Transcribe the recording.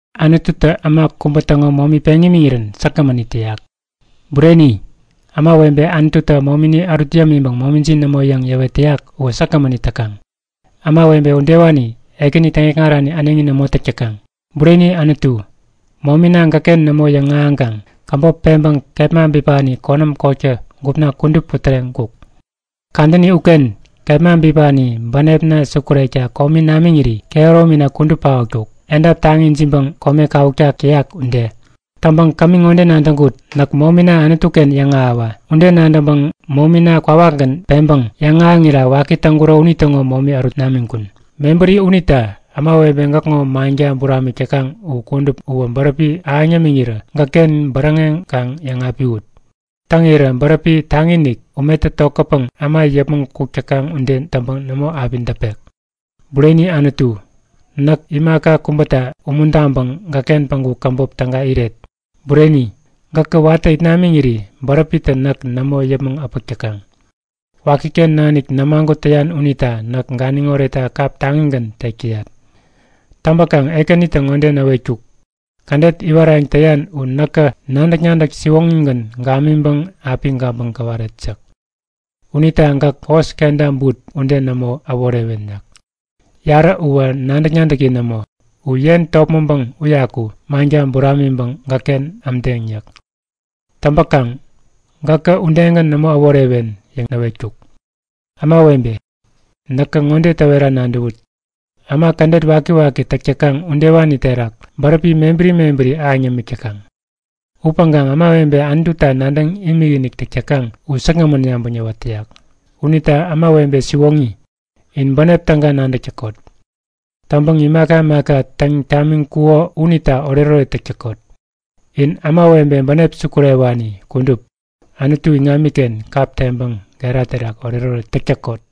Anututä äma kubä täŋo momi peŋ imiŋirän säkgämän it täyak. Bureni, ämawebe Anututä momini ärut yämiŋpäŋ momijin nämo yäŋ yäwet täyak uwä säkgämän it täkaŋ. Ämawebe udewani Ekäni täŋikŋarani äneŋi nämo täk täkaŋ. Bureni Anutu, momina gäkken nämo yäŋahäŋkaŋ käbop peŋpäŋ kepma bipani konäm kotkä gupna kudup putäreŋkuk. Kadäni uken kepma bipani bänepna sukurekta komi namiŋiri kehäromina kudup paotkuk, edap taŋi ijiŋpäŋ kome kawuktak täyak ude. Täŋpäŋ kämi ŋode nadäŋkut; Näk momina Anutuken yäŋahäwa! Ude nadäŋpäŋ momina kwawakgän peŋpäŋ yäŋahäŋira waki täŋkuro unitäŋo momi ärut namiŋkun. Mebäri unita ämawebe gäkŋo manka buramik täkaŋ u kudup bäräpi ahäŋ yämäwä gäkken bäräŋeŋ kaŋ yäŋapiwut! Täŋirä bäräpi taŋi-inik, umetä tokätpäŋ äma yäpmäŋ kuk täkaŋ ude täŋpäŋ nämo api däpek. Bureni Anutu, näk imaka kubäta umuntaŋpäŋ gäkken päŋku käbop täga iret. Bureni, gäkä watä it namiŋiri bäräpitä näk nämo yäpmäŋ äpäk täkaŋ. Wakiken nanik nämagut täyan unita näk ganiŋ oretta kap taŋigän tek täyat. Täŋpäkaŋ Ekänitä ŋode näwetkuk; Kädet iwarayäŋ täyan u näkä nadäk-nadäk siwoŋigän gamiŋpäŋ api gabäŋ gäwaret yäk. Unita gäk hos kenta but ude nämo äworewen yäk. Yarä uwä nadäk-nadäki nämo yäk. U yen topmäŋpäŋ wädäwikaŋ manka buramiŋpäŋ gäkken ämdeŋ yäk. Täŋpäkaŋ gäkä udegän nämo äworewen yäŋ näwetkuk. Ämawebe, näkä ŋode täwera nadäwut; Äma kädet wakiwaki täk täkaŋ udewani terak bäräpi mebäri mebäri ahäŋ yämik täkaŋ. Upäŋkaŋ ämawebe Anututa nadäŋ imikinik täk täkaŋ u säkgämän yabäŋ yäwat täyak. Unita ämawebe siwoŋi, in bänep täga nadäk täkot! Täŋpäŋ imaka imaka täŋ tamiŋkuko unita oretoret täk täkot! In ämawebe bänep sukurewani kudup, Anutu iŋamiken kap teŋpäŋ gera terak oretoret täk täkot!